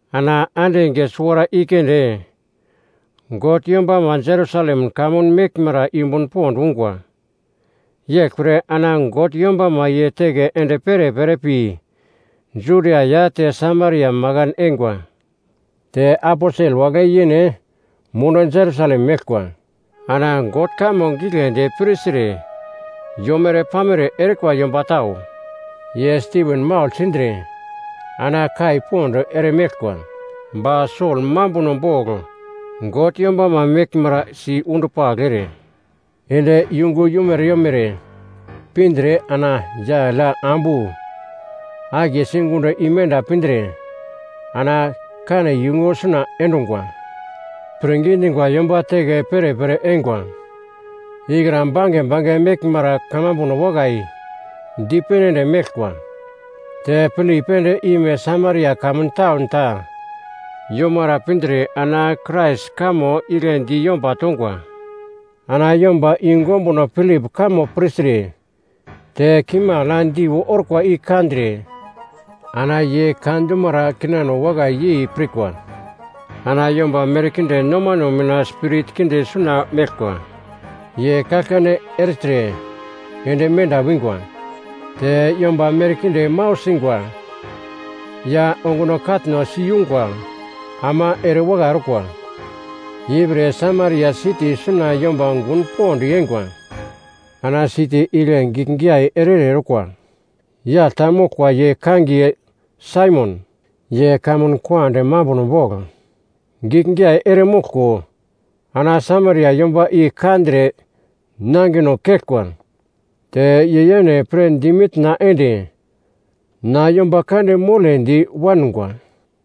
Ana ande enge suwara i keunde God yombama Jerusalem kamun meglmara yumbun pond ungwa. Yeglpre ana God yombama ye teke ende perepere pi Judia ya te Samaria makan eingwa. Te aposel wagle yene mundu Jerusalem meglkwa. Ana God kamo giglendi pirtre yomere-pamere erikwa yomba tau, ye Stiven maugl sindre ana kai pond eremeglkwa. Ba Sol mambuno bogl God yombama meglmara si-undupagl ere, ende yungu yomere yomere pindre ana yagl ya ambu akiye sigundo imenda pindre ana kane yungu suna endungwa. Pirngi dingwa yomba teke perepere eingwa ikra bange bange meglmara kamambuno wakai dipene ende meglkwa. Te Pilip ende ime Samaria kamun taun ta yomara pindre ana Krais kamo igle di yomba tongwa. Ana yomba yungu ombuno Pilip kamo pirtre te kimagl ya diu orkwa i kandre ana ye ka dumara kinano wakai yei pirkwa. Ana yomba merkinde nomano mina spirit kinde suna meglkwa ye kaglkane ertre ende menda wingwa. Te yomba merkinde mau singwa ya onguno katno siyungwa ama erewakai orkwa. Ipre Samaria siti suna yomba gun pond yeingwa. Ana siti igle giglgiyai ere-ere orkwa yagl ta moglkwa ye kangiye Saimon. Ye kamun kande mambuno bogl giglgiyai eremoglko ana Samaria yomba i kandre nangino keglkwa. Te ye yene pre dimitna ende na yomba kande mole di wangwa.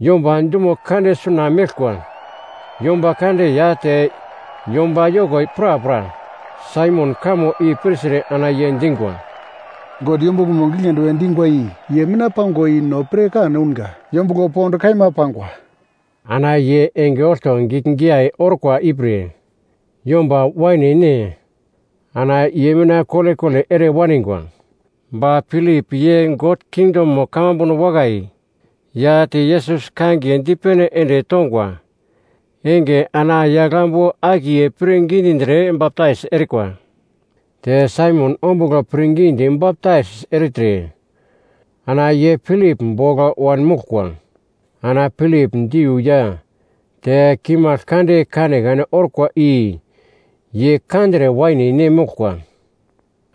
Yomba dumo kande suna meglkwa, yomba kande ya te yomba yoko prapra Saimon kamo i pirtre ana ye dingwa, “God yombuglomo giglendi we dingwa i ye mina pangwa i no pirkan ounga, Yombuglo Pond kaima pangwa.” Ana ye enge olto giglgiyai orkwa ipre yomba waine-ne ana ye mina kolekole ere waningwa. Ba Pilip ye God kingdomo kamambuno wakai ya te Yesus kangiye dipene ende tongwa enge ana yagl ambu akiye pirngi dindre baptais erikwa. Te Saimon ombugl pirngidi baptais ertre ana ye Pilip bogl wanmoglkwa. Ana Pilip diu ya te kimagl kande kanekane orkwa i ye kandre waine-ne moglkwa.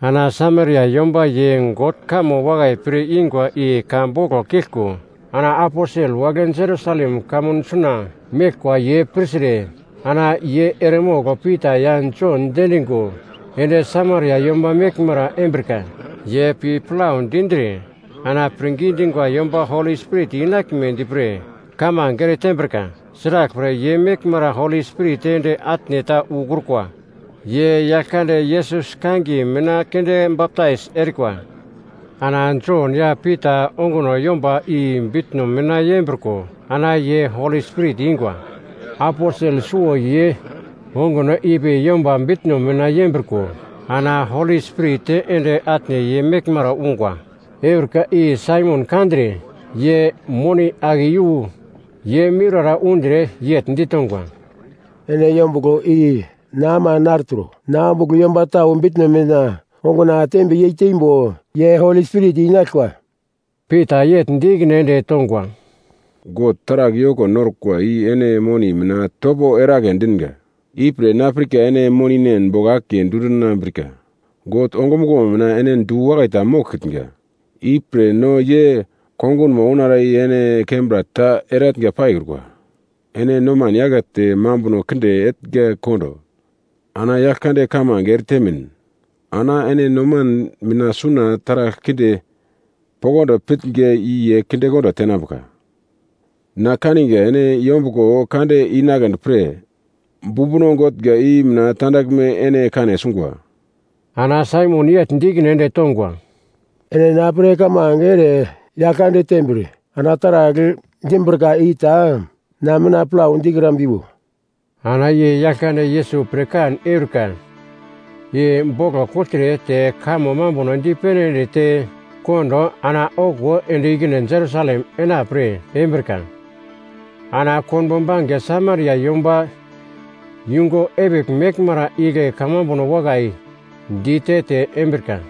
Ana Samaria yomba ye God kamo wakai pir ingwa i ka boglo kiglko ana aposel wagle Jerusalem kamun suna meglkwa ye pirtre, ana ye eremogl Pita ya Jon diendingo ende Samaria yomba meglmara embrika. Ye pi plau dindre ana pirngi dingwa yomba Holi Spirit inaglmedi pre kamange ere tembrika. Sraglpre, ye meglmara Holi Spirit ende atne ta ukrukwa. Ye Yaglkande Yesus kangiye mina keunde baptais erikwa. Ana Jon ya Pita onguno yomba i bitno mina yembriko ana ye Holi Spirit ingwa. Aposel suwo ye onguno ipi yomba bitno mina yembriko ana Holi Spirit ende atne ye meglmara ungwa. Eurika i Saimon kandre ye moni ake iyu ye miurara undre yegl ditongwa, “Ene yombuglo i na ama nartro. Na ombugl yomba tau bitno mina onguna tembe yeiteimbo ye Holi Spirit inaglkwa.” Pita yegl di ikine ende tongwa, “God taragl yoko norkwa i ene moni mina topo eragle dinga, ipre na pirka ene moninen bogl akiye dundinambrika. God ongumuglo mina ene du-wakai ta moglkitnga, ipre no ye kongunmo ounara i ene kembra ta eratnga paikrukwa. Ene noman yakete, mambuno kinde etnga kondo ana Yaglkande kamange eretemin, ana ene noman mina suna taragl kinde poglodi pitnga i ye kindekondo tenambuka. Na kaninga ene yombuglo kande inagledi pre bumbuno gotnga i mina tandaglme ene kane sungwa.” Ana Saimon yegl di ikine ende tongwa, “Ene na pre kamange ere Yaglkande tembir ana taragl dimbrika i ta na mina plau dikrambiwo.” Ana ye Yaglkande Yesus pirkan eurika i boglo kugltre te kamo mambuno dipene ende te kondo ana okuwo ende ikine Jerusalem enapre embrika. Ana konbo bange Samaria yomba yungu epigl meglmara igle kamambuno wakai dite-te embrika.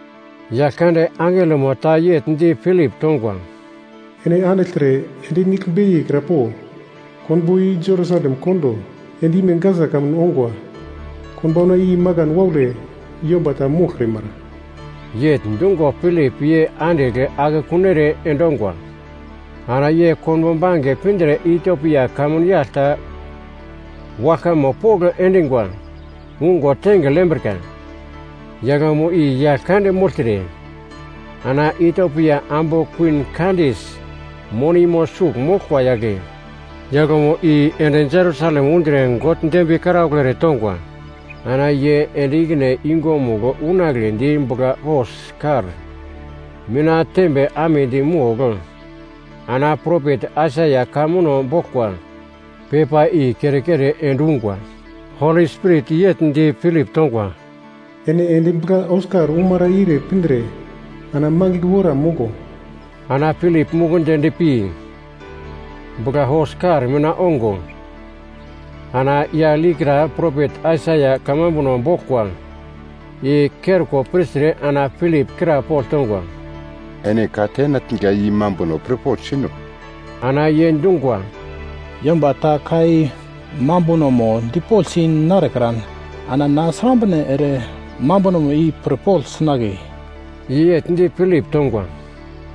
Yaglkande angelomo ta yegl di Pilip tongwa, “Ene andigltre ende nigl beiye kra po, konbo i Jerusalem kondo end-ime Gasa kamun ongwa. Konbaunamo i makan waule yomba ta moglkrimara.” Yegl dungo Pilip ye andigl akekun ere endongwa. Ana ye konbo bange pindre Itiopia kamun yagl ta waglkamo pogl endingwa ungo tengigl yembrika. Yaglmo i yagl kande mogltre ana Itiopia ambu kuwin Kandes monimo sugl moglkwa yagle. Yaglmo i ende Jerusalem undre God dembiye karaugl eretongwa. Ana ye ende ikine yungumugl unagledi bugla-hos-kar mina tembe amedi mogl ana propet Aisaia ka muno boglkwa pepa i kere-kere endungwa. Holi Spirit yegl di Pilip tongwa, “Ene ende bugla-hos-kar umara ire pindre ana mangigl wora moglo.” Ana Pilip mukundi endpi bugla-hos-kar mina ongo ana yagl ikra propet Aisaia kamambuno boglkwa i kerko pirtre ana Pilip krapogl tongwa, “Ene ka ketnga i mambunomo pirpogl sino?” Ana ye dungwa, “Yomba ta ka i mambunomo dipoglsi narekran ana na srambre ere mambuno i pirpogl sinagle?” Ye yegl di Pilip tongwa,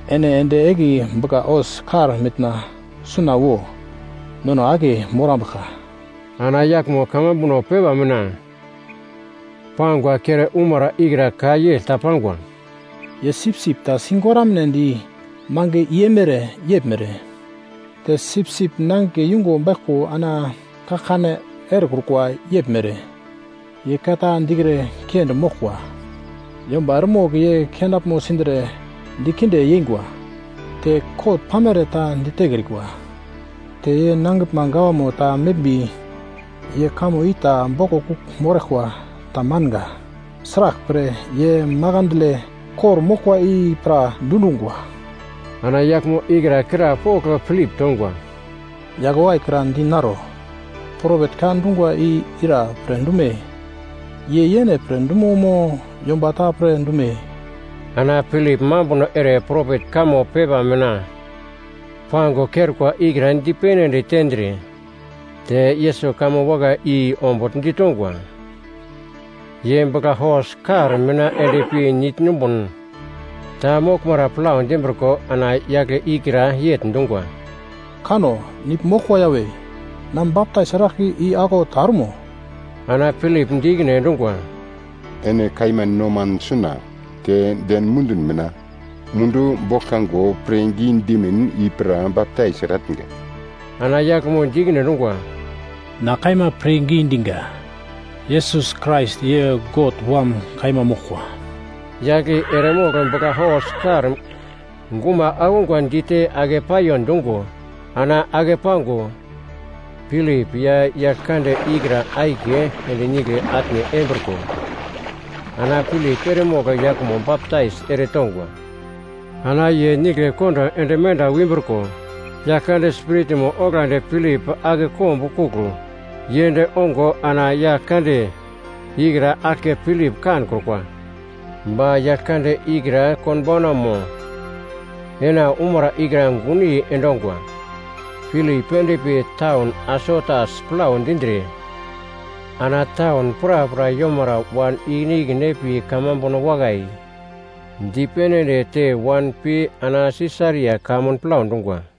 “Ene ende egli bugla-hos-kar mina suna wo, nono akiye morambuglka.” Ana yaglmo kamambuno pepa mina pangwa kere umara ikra ka yegl ta pangwa: “Ye sipsip ta sigoramnedi mange i eimere yeglmere. Te sipsip nangigle yungo baiglko ana kaglkane erekrukwa yeglmere, ye ka ta dikre kiendi moglkwa. Yomba eremogl ye kenaglmo sindre dikinde yeingwa, te kot pamere ta ditekrikwa, te ye nangiglma gawamo ta meglmbi ye kamo i ta boglo kugl moraglkwa tamanga. Sraglpre, ye makandle kor-moglkwa i pra dundungwa.” Ana yaglmo ikra krapogl Pilip tongwa, “Yagl wakai kra dinaro, propet ka dungwa i ira pre dume? Ye yene pre dumo mo yomba ta pre dume?” Ana Pilip mambuno ere propet kamo pepa mina pango kerkwa ikra dipene ende tendre te Yesus kamo wakai i ombugl ditongwa. Ye bugla-hos-kar mina endpi nigl numbun ta moglmara plau dimbriko ana yagle ikra yegl dungwa, “Kano! Nigl moglkwa yawe. Na baptais eraglka i aglau ta ormo?” Ana Pilip di ikine endungwa, “Ene kaima noman suna, te den mundun mina, mundu boglkango pirngi dimin i pra baptais eratnga.” Ana yaglmo di ikine endungwa, “Na kaima pirngi dinga, Yesus Krais ye God Wam kaima moglkwa.” Yagl i eremogl bugla-hos-kar guma akungwa dite ake paiyo dungo ana ake pango, Pilip ya yagl kande ikra akiye ende nigle atne embriko, ana Pilip eremogl yaglmo baptais eretongwa. Ana ye nigle kondo ende menda wimbriko, Yaglkande Spiritmo oglandi Pilip ake kombukugl yend ongo ana yagl kande ikra aglke Pilip kankrukwa. Ba yagl kande ikra konbaunamo ena umara ikra gunyei endongwa. Pilip endpi taun Asotas plau dindre ana taun prapra yomara wan ikine ikine pi kamambuno wakai dipene ende te wan pi ana Sisaria kamun plau dungwa.